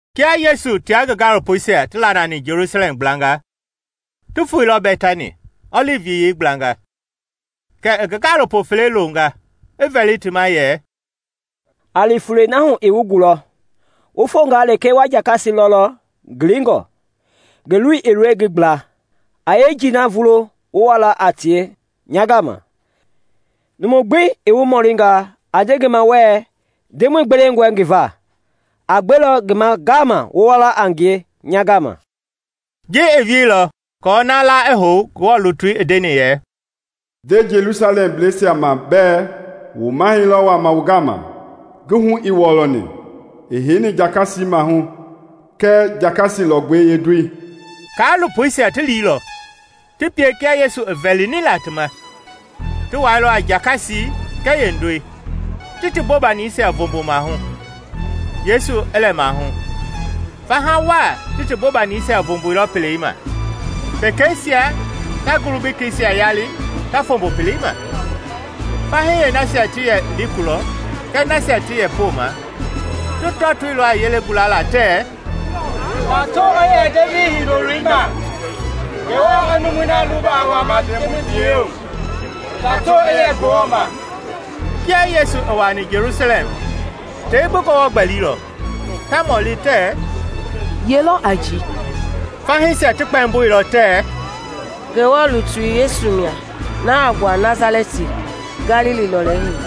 Kia Yesu tia ngi gaalopoisia ti laalani Jelusalɛm gblanga, ti foeilɔ Bɛtani, ɔlivi Yiyei gblanga, kɛ i ngi gaalopo fele longa, i vɛli ti ma yɛ, “A li fulei na hu i wu gulɔ; wu fongaa lekee wa jakasi lɔlɔ ngilingɔ, ngi loi i ngi gbla. A yeenjei vulo wu wa a tie nya gama. Numu gbi i wu mɔlinga, a nde ngi ma wɛɛ, ‘Ndemɔi gbewengɔe ti va,’ a gbelɔ ti ma ngaama wu wa a tie.” Ji i wieilɔ aako na la i hou Ngewɔ lutui i ndeni yɛ, “Nde Jelusalɛmblɛisia ma bɛɛ wu mahɛi lɔ wama wu gama, Ngi hu ii wɔlɔni, i heini jakasi maahu kɛɛ jakasi lɔgbɛi yeendoi.” Kaalopoisia ti liilɔ, ti pie kia Yesu i vɛlini la ti ma; ti wɛilɔ a jakasi kɛɛ yeendoi, ti ti bobanisia voombo maahu, Yesu i lɛ maahu. Faha waa ti ti bobanisia voomboilɔ pelei ma, pekeisia ta ngulu bekeisia yali ta fombo pelei ma. Fahii yeenasia ti yɛ li kulɔ kɛɛ nasia ti yɛ wa poma ti tɔtoilɔ a yelei gulala tɛɛ, “Tato i yɛ Devidi Hindoloi ma! Ngewɔ i numui na luba i wama Ndemɔi biyei hu! Tato i yɛ Ngewɔ ma!” Kia Yesu i wuaani Jelusalɛm tei gbi gɔwɔ i gbɛlilɔ, ta mɔli tɛɛ, “Ye lɔ a ji?” Fahiisia ti kpɛmboilɔ tɛɛ, “Ngewɔ lutui Yesu mia, na a gbua Nasalɛti, Galili lɔlei hu.”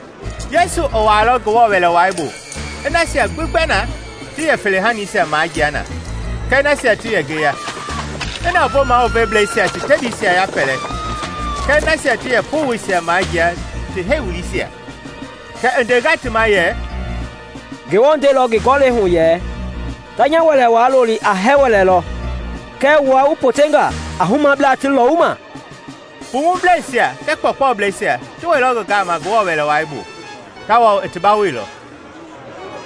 Yesu i wuailɔ Ngewɔ Wɛlei Wai bu i nasia gbi gbɛ na ti yɛ fele-haniisia majia na kɛɛ nasia ti yɛ ngeya, i navoo maluveblɛisia ti tebiisia yapɛlɛ kɛɛ nasia ti yɛ powoisia majia ti heiwuliisia. Kɛ i ndenga ti ma yɛ, “Ngewɔ ndeilɔ ngi Gɔlɛi hu yɛ, ‘Ta nya Wɛlei Wai loli a hɛɛ-wɛlɛ lɔ’; kɛɛ wua wu potenga ‘a humablaa ti lɔwuma.’” Pumublɛisia kɛɛ kpɔɔkpɔblɛisia ti wɛilɔ ngi gama Ngewɔ Wɛlei Wai bu, tawao i ti bawoilɔ.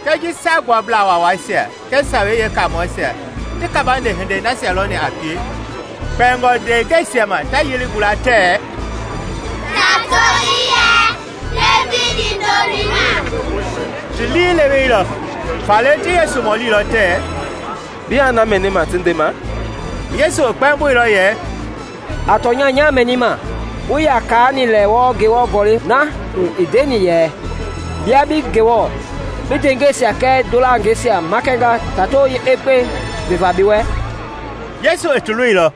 Kɛɛ ji Saagbuablaa Waawaisia kɛɛ sawei yeekamɔiɛisia ti kabande hinde nasia lɔni a pie, kpɛingɔ ndeengɛisia ma ta yelei gula tɛɛ, “Tato i yɛ Devidi Hindoloi ma!” ti liileweilɔ. Faale ti Yesu mɔlilɔ tɛɛ, “Biaa na mɛnima ti ndema?” Yesu i kpɛmbɔilɔ yɛ, “A tɔnya nyaa mɛnima, wuii yaa kaani lɛ wɔɔ Ngewɔ Gɔlɛi na hu i ndeni yɛ, ‘Bia bi Ngewɔ bi ndeengɛisia kɛɛ ndolangeisia makɛnga tatoi yeekpekpei veva bi wɛ?’” Yesu i ti lɔilɔ,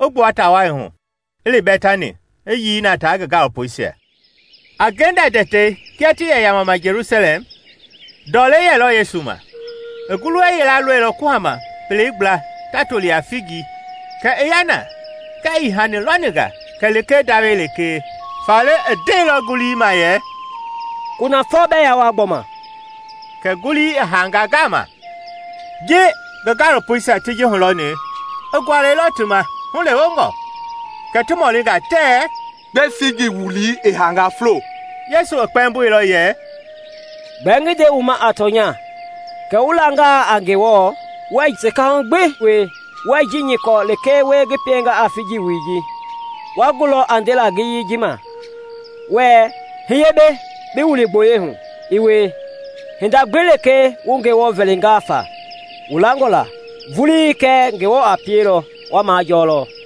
i gbua taa wai hu, i li Bɛtani, i yii na tia ngi gaalopoisia. A ngenda tɛtei kia ti yɛ yamama Jelusalɛm ndɔlei yɛlɔ Yesu ma. I ngulu yila lɔilɔ kuhama pelei gbla ta toli a figi, kɛ i ya na kɛɛ ii hani lɔni nga kɛlee ndawɛi lekee. Faale i ndeilɔ yeengulii ma yɛ, “Kunafɔ bɛɛ yaa wua gbɔma!” Kɛ ngulii i haanga ngaama. Ji ngi gaalopoisia ti ji hulɔni, i gualɛilɔ ti ma hulewengɔ, kɛ ti mɔlinga tɛɛ, “Gbɛe figi wulii i haanga fulo?” Yesu i kpɛmboilɔ yɛ, “Gbɛɛ ngi nde wu ma a tɔnya kɛ wu langalɔ a Ngewɔ, wuɛɛ sekahu gbi wie, wuɛɛ i ji nyɔkɔ lekee wie ngi pienga a figi wulii, wa gulɔ a ndela ngiyei ji ma wɛɛ, ‘Hiye mbei bi wili gboyei hu,’ i wie. Hinda gbi lekee wu Ngewɔ vɛlingalɔ fa, wu langɔ la vulii kɛ Ngewɔ a pielɔ, wa majɔɔlɔ.”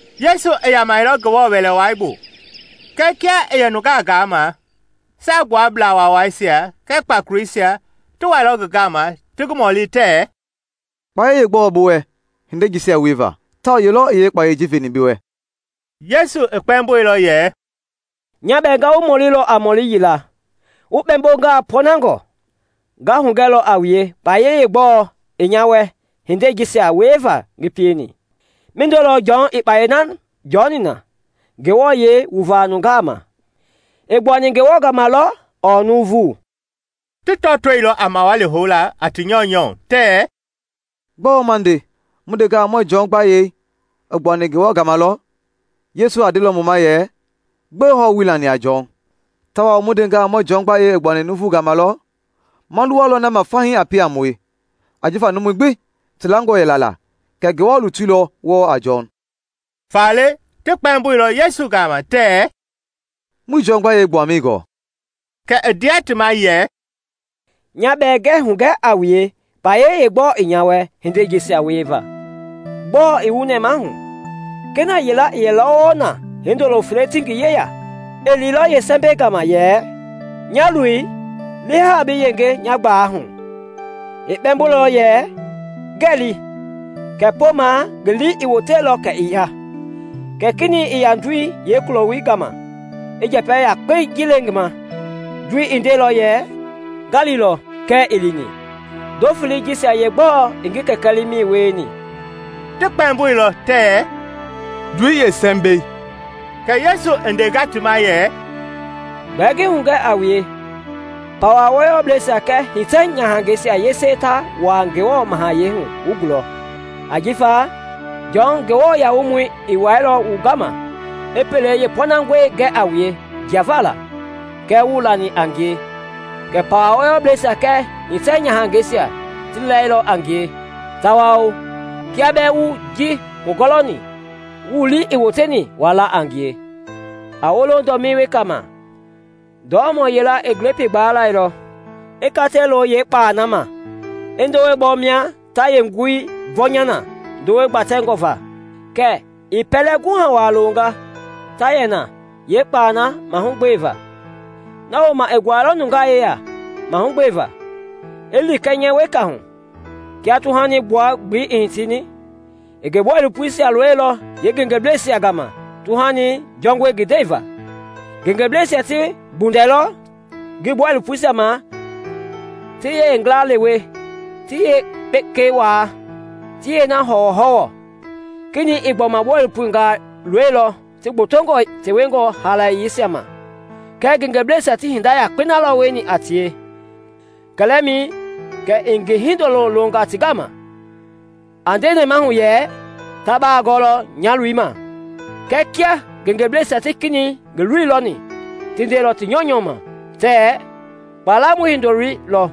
Yesu i yamɛilɔ Ngewɔ Wɛlei Wai bu kɛɛ kia i yɛ nungaa gaama, Saagbuablaa Waawaisia kɛɛ kpakoleisia ti wailɔ ngi gama ti ngi mɔli tɛɛ, “Kpayei yeegbɔɔ i bi wɛ hindei jisia wieva, tawao ye lɔ i yeekpayɛi ji veni bi wɛ?” Yesu i kpɛmboilɔ yɛ, “Nya bɛɛ nga wu mɔlilɔ a mɔli yila, wu kpɛɛmbongaa pɔɔnangɔ, nga hugɛlɔ a wue kpayei yeegbɔɔ i nya wɛ hindei jisia wieva ngi pieni. Mindo lɔ Jɔn i kpayei na jɔni na Ngewɔ yɛi wuvaa nungaa ma? I gbuani Ngewɔ gama lɔ ɔɔ nuuvu?” Ti tɔtoilɔ a mawali houla a ti nyɔunyɔ tɛɛ, “Gbɔɔ ma nde? Mu ndengaa muɛɛ Jɔn gbayei i gbuani Ngewɔ gama lɔ, Yesu a ndelɔ mu ma yɛ, ‘Gbɛe hɔɔ wuii lani a Jɔn?’ Tawao mu ndengaa muɛɛ ‘Jɔn gbayei i gbuani nuuvu gama lɔ,’ ma luwalɔ na ma fahii a pie a mue, ajifa numui gbi ti langɔ yɛla la kɛ Ngewɔ lutui lɔ wɔɔ a Jɔn.” Faale ti kpɛmbɔilɔ Yesu ma tɛɛ, “Muii Jɔn gbayei gbuamɛi gɔɔ.” Kɛ i ndea ti ma yɛ, “Nya bɛɛ ngɛɛ hugɛ a wue kpayei yeegbɔɔ i nya wɛ hindei jisia wieva.” “Gbɔɔ i wu nɛmahu? Kena yila i yɛlɔ wɔɔ na hindolo fele ti ngi yeya. I liilɔ yeesɛmbɛi gama yɛ, ‘Nya loi, li haa bi yenge nya gbalei hu.’ I kpɛmboilɔ yɛ, ‘Ngɛɛ li’, kɛɛ poma ngi lii i woteilɔ kɛ i ya. Kɛ kenɛi i ya ndoi yeekuloi gama i yeenjɛpɛ yakpei le ngi ma. Ndopoi i ndeilɔ yɛ, ‘Nga lilɔ’, kɛɛ ii lini. Ndo felei jisia yeegbɔɔ i ngi kɛkɛ liimɛi wieni?” Ti kpɛmboilɔ tɛɛ, “Ndoi yeesɛmbɛi.” Kɛ Yesu i ndenga ti ma yɛ, “Gbɛɛ ngi hugɛ a wue: pawa wɔyɔblɛisia kɛɛ hitɛ-nyahangɛisia yese ta wuaa Ngewɔ Mahayɛi hu wu gulɔ. Ajifa Jɔn Nguamɔi i wɛilɔ wu gama i pelei yeepɔnangɔi gɛ a wue jiava la, kɛɛ wuii lani a ngie; kɛɛ pawa wɔyɔblɛisia kɛɛ hitɛ-nyahangɛisia ti lɛilɔ a ngie; tawao kia bɛɛ wu ji hulɔni, wu lii ii woteni waa la a ngie.” “A wolo dɔmii weka ma. Ndɔlɔmɔ yila i glepii gbaa lɛilɔ, I kata loilɔ yeekpalɛi na ma, i ndowei bɔ mia ta yeenguɛi vɔnya na ndɔi gbatɛ va, kɛ i pɛlɛ guha waa loonga ta yɛ na yeekpalɛi mahugbe va. Na woma i guailɔ nungaa yeya mahugbeva, i li kɛnyɛ weka hu. Kia tuhani gbua-gbelei i hitini, i ngi bɔilopoisia loilɔ yeengengebleisia gama tuhani jɔngɔi ngi ndɛi va. Ngengeblɛisia ti gbundɛilɔ ngi bɔilopoisia ma, ti yeengila lewe, ti yeepekei waa, ti yeena hɔwɔhɔwɔ. Kenɛi i gbɔma bɔilopongaa loilɔ, ti gbotongɔ tewengɔ haalayeisia ma, kɛɛ ngengeblɛisia ti hinda yakpei na lɔ wieni a tie. Kɛlɛmɛi kɛ i ngi hindoloi longa ti gama, a nde nɛmahu yɛ, ‘Ta baa gɔɔlɔ nya loi ma.’ Kɛɛ kia ngengeblɛisia ti kenɛi loi lɔni, ti ndeilɔ ti nyɔunyɔ ma tɛɛ, ‘Kpalamɔi hindoloi lɔ,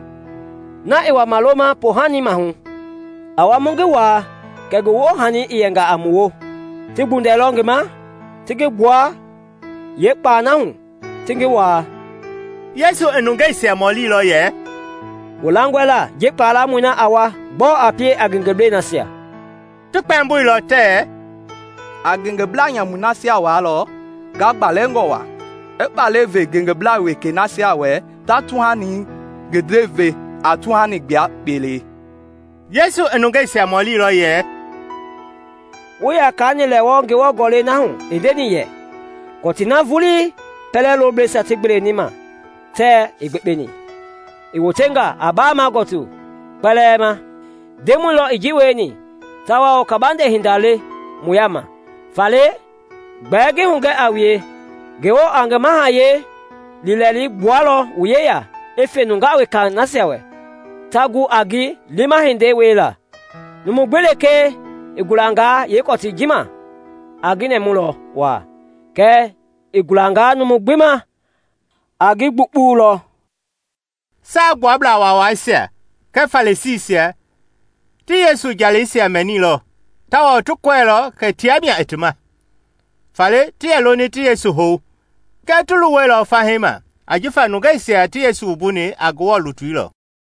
na i wama loma poohani maahu. A wa mu ngi waa kɛ ngi woohani i yɛnga a mu woo.’ Ti gbundɛilɔ ngi ma, ti gbua a ngie kpalɛi hu, ti ngi waa.” Yesu i nungeisia mɔlilɔ yɛ, “Wu langɔ la ji kpalamɔi a wa, gbɔɔ a pie a ngengeblɛi nasia?” Ti kpɛmboilɔ tɛɛ, “A ngengeblaa nyamui nasia waalɔ ngagbalɛngɔ waa, i kpalɛi ve ngengeblaa wekei nasia wɛ ta tuhani ngi ndɛi ve a tuhani gbua-gbelei.” Yesu i nungeisia mɔlilɔ yɛ, “Wuii yaa kaani lɛ wɔɔ Ngewɔ Gɔlɛi na hu i ndeni yɛ, ‘Kɔtii na vulii pɛlɛ loblɛisia ti gbeleni ma tɛɛ ii gbekpeni, i wotenga a baama gɔtu kɔtii kpɛlɛɛ ma. Ndemɔi lɔ i ji wieni tawao kabande hinda le mu yaama’? “Faale gbɛɛ ngi hugɛ a wue, Ngewɔ a ngi Mahayɛi hu liilɛi gbualɔ wu yeya i fe nungaa wekei nasia wɛ ta gu a ngi liima hindei wiela. [ Numu gbi lekee i gulangaa yeekɔtii ji ma a ngi nɛɛmulɔ waa, kɛɛ i gulangalɔ numu gbi ma a ngi gbukpulɔ.]” Saagbuablaa Waawaisia kɛɛ Farisiisia ti Yesu jaleisia mɛnilɔ tawao ti kɔɛilɔ kɛ tia mia i ti ma. Faale ti yɛ loni ti Yesu hou kɛɛ ti luwɛilɔ fahii ma ajifa nungeisia ti Yesu wumbuni a Ngewɔ lutui lɔ.